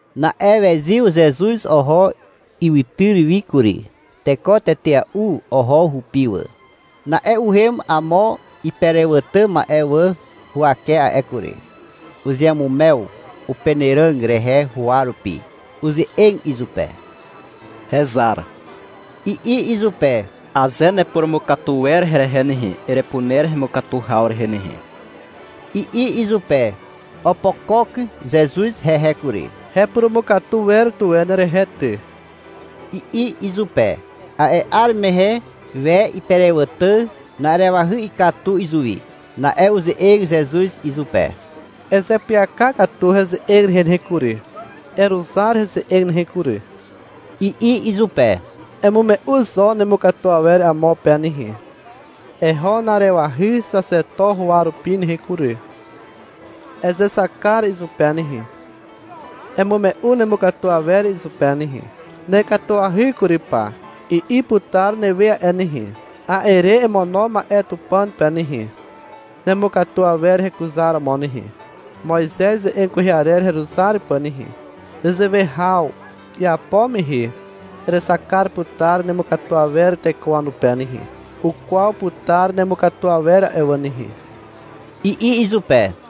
Na'e wezyw Zezuz oho ywytyr wi kury. Teko tetea'u oho hupi wà. Na'e uhem amo iperewàtà ma'e wà huwake a'e kury. Uzeamumew upenàràg rehe huwa rupi. Uze'eg izupe. — Hezar, i'i izupe. — Aze nepurumukatu wer herehe nehe, erepuner hemukatu haw rehe nehe, i'i izupe. Opokok Zezuz hehe kury. — Hepurumukatu wer tuwe nerehe ty, i'i izupe. A'e 'ar mehe we iperewàtà na'arewahy ikatu izuwi. Na'e uze'eg Zezuz izupe. — Ezeapyaka katu heze'eg rehe nehe kury, eruzar heze'eg nehe kury, i'i izupe. — Emume'u zo nemukatu awer amo pe nehe. Eho na'arewahy xaxeto huwa rupi nehe kury. Ezexak kar izupe nehe, emume'u nemukatu awer izupe nehe. — Nekatuahy kury pa, i'i putar newe a'e nehe. A'e re emono ma'e Tupàn pe nehe, nemukatu awer hekuzaromo nehe, Moizez ze'eg kwehe arer heruzar pà nehe. Nezewe haw iapo mehe erexak kar putar nemukatu awer teko wanupe nehe. Ukwaw putar nemukatu awer a'e wà nehe, i'i izupe.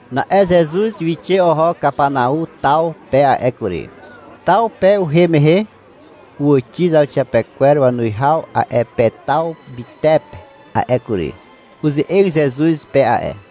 Na'e Zezuz wixe oho Kapanau taw pe a'e kury. Taw pe uhem mehe uwàxi zauxiapekwer wanuwihaw a'e pe taw mytepe a'e kury. Uze'eg Zezuz pe a'e.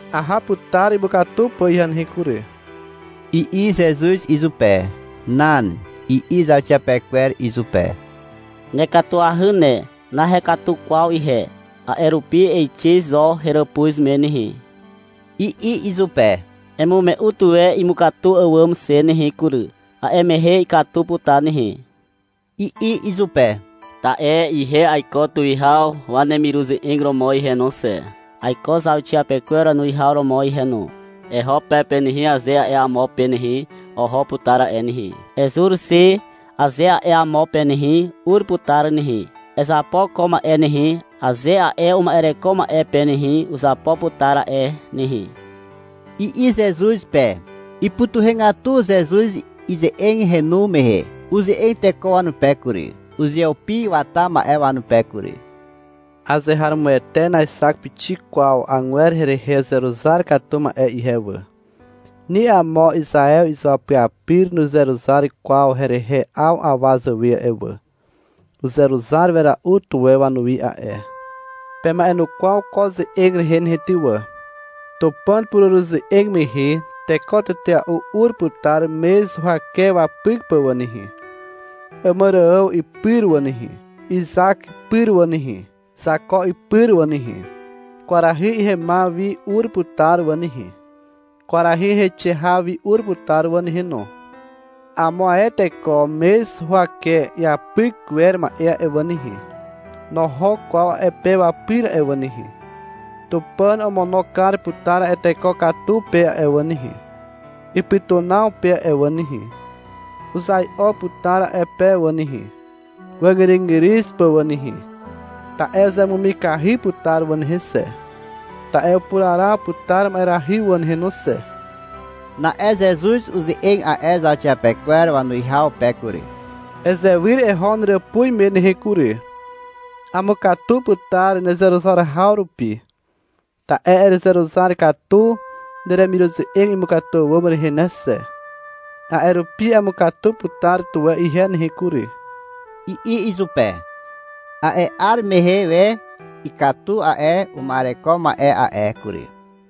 — Aha putar imukatu pà ihe nehe kury, i'i Zezuz izupe. — Nan, i'i zauxiapekwer izupe. — Nekatuahy ne, nahekatu kwaw ihe, a'e rupi eixe zo heràpuz me nehe, i'i izupe. — Emume'u tuwe imukatu àwàm xe nehe kury, a'e mehe ikatu putar nehe, i'i izupe. — Ta'e ihe aiko tuwihaw wanemiruze'eg romo ihe no xe, aiko zauxiapekwer wanuwihaw romo ihe no. — Eho pe pe nehe, aze a'e amo pe nehe, oho putar a'e nehe. — Ezur xe, aze a'e amo pe nehe, ur putar nehe. — Ezapo ko ma'e nehe, aze a'e uma'ereko ma'e pe nehe, uzapo putar a'e nehe, i'i Zezuz pe. Ipytuhegatu Zezuz ize'eg henu mehe. Uze'eg teko wanupe kury, uzeupi wata ma'e wanupe kury. — Azeharomoete naexak pixik kwaw agwer herehe uzeruzar katu ma'e ihe wà. Ni amo Izaew izuapyapyr nuzeruzar kwaw herehe 'aw awa zàwe a'e wà. Uzeruzar wera'u tuwe wanuwi a'e. Pema'enukwaw ko ze'eg rehe nehe ty wà. — Tupàn pureruze'eg mehe teko tetea'u ur putar mez huwake wapyk pà wà nehe, Àmàrààw ipyr wà nehe, Izak ipyr wà nehe, Zako ipyr wà nehe. Kwarahy ihemaw wi ur putar wà nehe, kwarahy heixe haw wi ur putar wà nehe no. Amo ae teko mez huwake iapyk wer ma'e a'e wà nehe, noho kwaw a'e pe wapyr a'e wà nehe. Tupàn omono kar putar a'e teko katu pe a'e wà nehe, ipytunaw pe a'e wà nehe. Uzai'o putar a'e pe wà nehe, wàzgyrygyryw pà wà nehe, ta'e uzemumikahy putar wà nehe xe, ta'e upuraraw putar ma'erahy wà nehe no xe. Na'e Zezuz uze'eg a'e zauxiapekwer wanuwihaw pe kury. — Ezewyr eho neràpuz me nehe kury. Amukatu putar nezeruzar haw rupi. Ta'e erezeruzar katu neremiruze'eg imukatu àwàm rehe ne xe. A'e rupi amukatu putar tuwe ihe nehe kury, i'i izupe. A'e 'ar mehe we ikatu a'e uma'ereko ma'e a'e kury.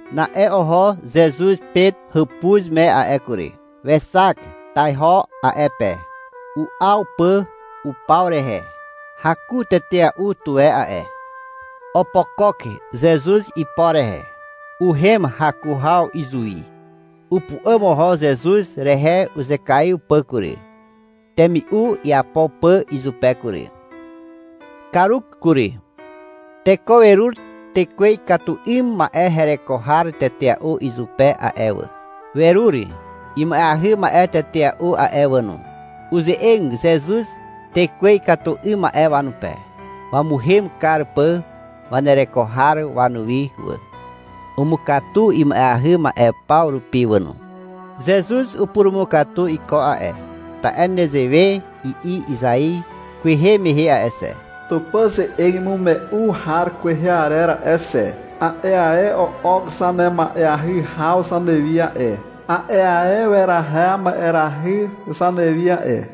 Na'e oho Zezuz Pet hàpuz me a'e kury. Wexak taiho a'e pe. U'aw pà upaw rehe. Haku tetea'u tuwe a'e. Opokok Zezuz ipo rehe. Uhem haku haw izuwi. Upu'àm oho Zezuz rehe uzekaiw pà kury, temi'u iapo pà izupe kury. Karuk kury. Teko werur tekwe ikatu 'ym ma'e hereko har tetea'u izupe a'e wà. Werur ima'eahy ma'e tetea'u a'e wà no. Uze'eg Zezuz tekwe ikatu 'ym ma'e wanupe, wamuhem kar pà wanereko har wanuwi wà. Umukatu ima'eahy ma'e paw rupi wà no. Zezuz upurumukatu iko a'e, ta'e nezewe i'i Izai kwehe mehe a'e xe, Tupàn ze'eg imume'u har kwehe arer a'e xe. A'e ae o'ok zanema'eahy haw zanewi a'e. A'e ae weraha ma'erahy zanewi a'e.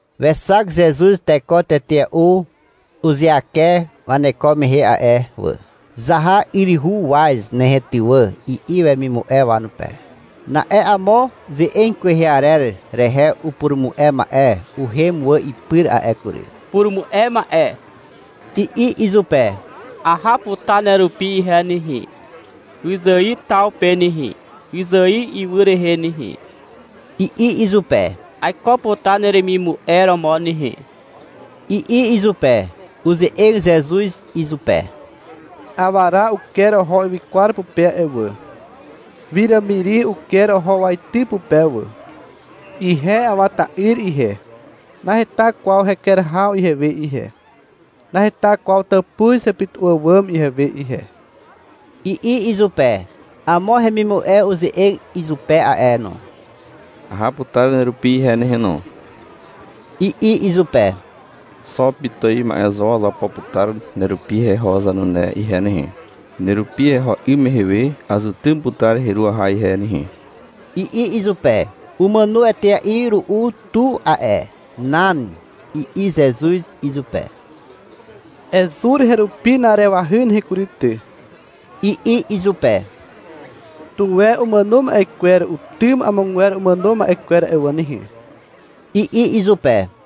Wexak Zezuz teko tetea'u uzeake waneko mehe a'e wà. — Zaha yryhu waz nehe ty wà, i'i wemimu'e wanupe. Na'e amo ze'eg kwehe arer rehe upurumu'e ma'e uhem wà ipyr a'e kury. — Purumu'e ma'e, i'i izupe. — Aha putar nerupi ihe nehe, wyzài taw pe nehe, wyzài ywy rehe nehe, i'i izupe. — Aiko putar neremimu'e romo nehe, i'i izupe. Uze'eg Zezuz izupe. — Awara uker oho ywykwar pupe a'e wà. Wiràmiri uker oho waity pupe wà. Ihe Awa ta'yr ihe, naheta kwaw heker haw ihewe ihe, naheta kwaw tàpuz hepytu'u àwàm ihewe ihe, i'i izupe. Amo hemimu'e uze'eg izupe a'e no. — Aha putar nerupi ihe nehe no, i'i izupe. — Xo pitài ma'e zo azapo putar nerupi heho zanune ihe nehe. Nerupi heho 'ym mehe we azutym putar heru aha ihe nehe, i'i izupe. (Umàno etea'i ru'u tu a'e.) — Nan, i'i Zezuz izupe. — Ezur herupi na'arewahy nehe kury ty, i'i izupe. — Tuwe umàno ma'e kwer utym amogwer umàno ma'e kwer a'e wà nehe, i'i izupe.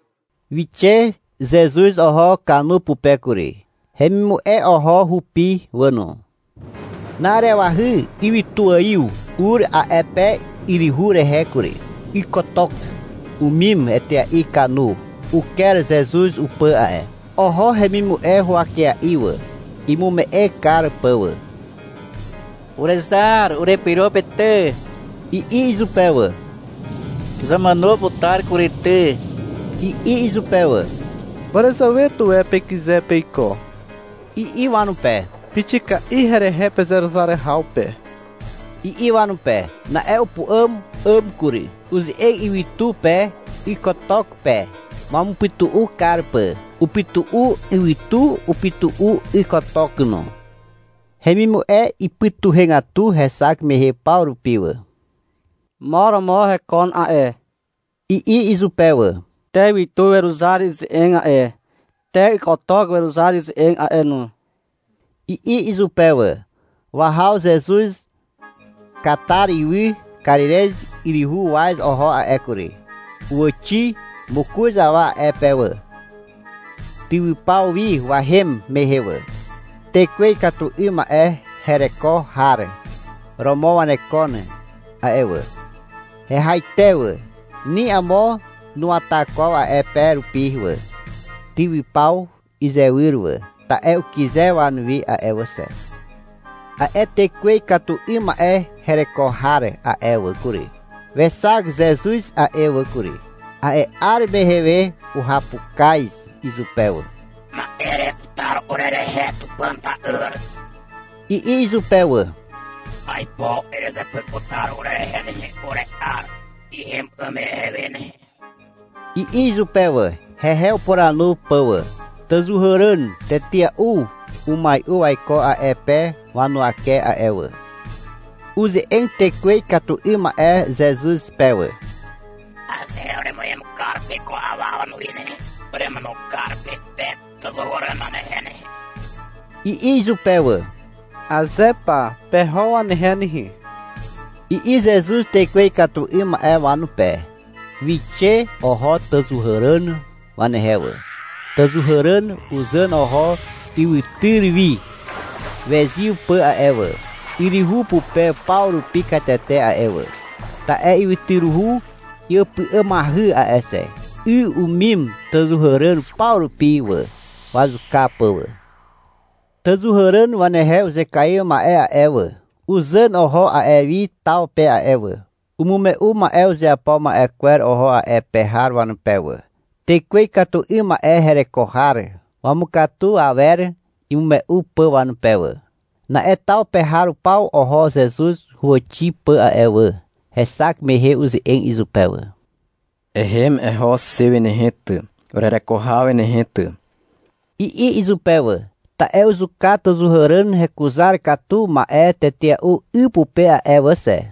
Wixe Zezuz oho kanu pupe kury. Hemimu'e oho hupi wà no. Na'arewahy ywytuaiw ur a'e pe yryhu rehe kury. Ykotok umim etea'i kanu. Uker Zezuz upà a'e. Oho hemimu'e huwakea'i wà, imume'e kar pà wà. — Urezar, urepyro pe ty, i'i izupe wà. — Zàmàno putar kury ty, i'i izupe wà. — Màràzàwe tuwe pekyze peiko, i'i wanupe. — Pixika'i herehe pezeruzar haw pe, i'i wanupe. Na'e upu'àm 'àm kury. Uze'eg ywytu pe ykotok pe, wamupytu'u kar pà. Upytu'u ywytu, upytu'u ykotok no. Hemimu'e ipytuhegatu hexak mehe paw rupi wà. — Mo romo hekon a'e, i'i izupe wà. — Te ywytu weruzar ize'eg a'e, te ykotok weruzar ize'eg a'e no, i'i izupe wà. Wahaw Zezuz Katar ywy Karirez yryhu waz oho a'e kury. Uwàxi mokoz awa a'e pe wà, tywypaw wi wahem mehe wà. Tekwe ikatu 'ym ma'e hereko har romo wanekon a'e wà. Hehaite wà. Ni amo nuwata kwaw a'e pe rupi wà, tywypaw izywyr wà, ta'e ukyze wanuwi a'e wà xe. A'e tekwe ikatu 'ym ma'e hereko har a'e wà kury, wexak Zezuz a'e wà kury. A'e 'ar mehe we uhapukaz izupe wà. — Ma'e ereputar urerehe, Tupàn ta'yr, i'i izupe wà. — Aipo erezepyk putar urerehe nehe, ure'ar ihem 'ym mehe we nehe, i'i izupe wà, hehe upuranu pà wà. Tàzàhuràn tetea'u umai'u waiko a'e pe wanuwake a'e wà. Uze'eg tekwe ikatu 'ym ma'e Zezuz pe wà. — Aze uremuhem kar pe ko awa wanuwi nehe, uremono kar pe pe tàzàhuràn wanehe nehe, i'i izupe wà. — Aze pa, peho wanehe nehe, i'i Zezuz tekwe ikatu 'ym ma'e wanupe. Wixe oho tàzàhuràn wanehe wà. Tàzàhuràn uzàn oho ywytyr wi wezyw pà a'e wà, yryhu pupe paw rupi katete a'e wà. Ta'e ywytyruhu iàpy'àmahy a'e xe. 'Y umim tàzàhuràn paw rupi wà, wazuka pà wà. Tàzàhuràn wanehe uzekaiw ma'e a'e wà, uzàn oho a'e wi taw pe a'e wà. Umume'u ma'e uzeapo ma'e kwer oho a'e pe har wanupe wà, tekwe ikatu 'ym ma'e hereko har wamukatu awer imume'u pà wanupe wà. Na'e taw pe har paw oho Zezuz huwàxi pà a'e wà. Hexak mehe uze'eg izupe wà. — Ehem eho xe wi nehe ty, urereko haw wi nehe ty, i'i izupe wà (ta'e uzuka tàzàhuràn hekuzar katu ma'e tetea'u 'y pupe a'e wà xe).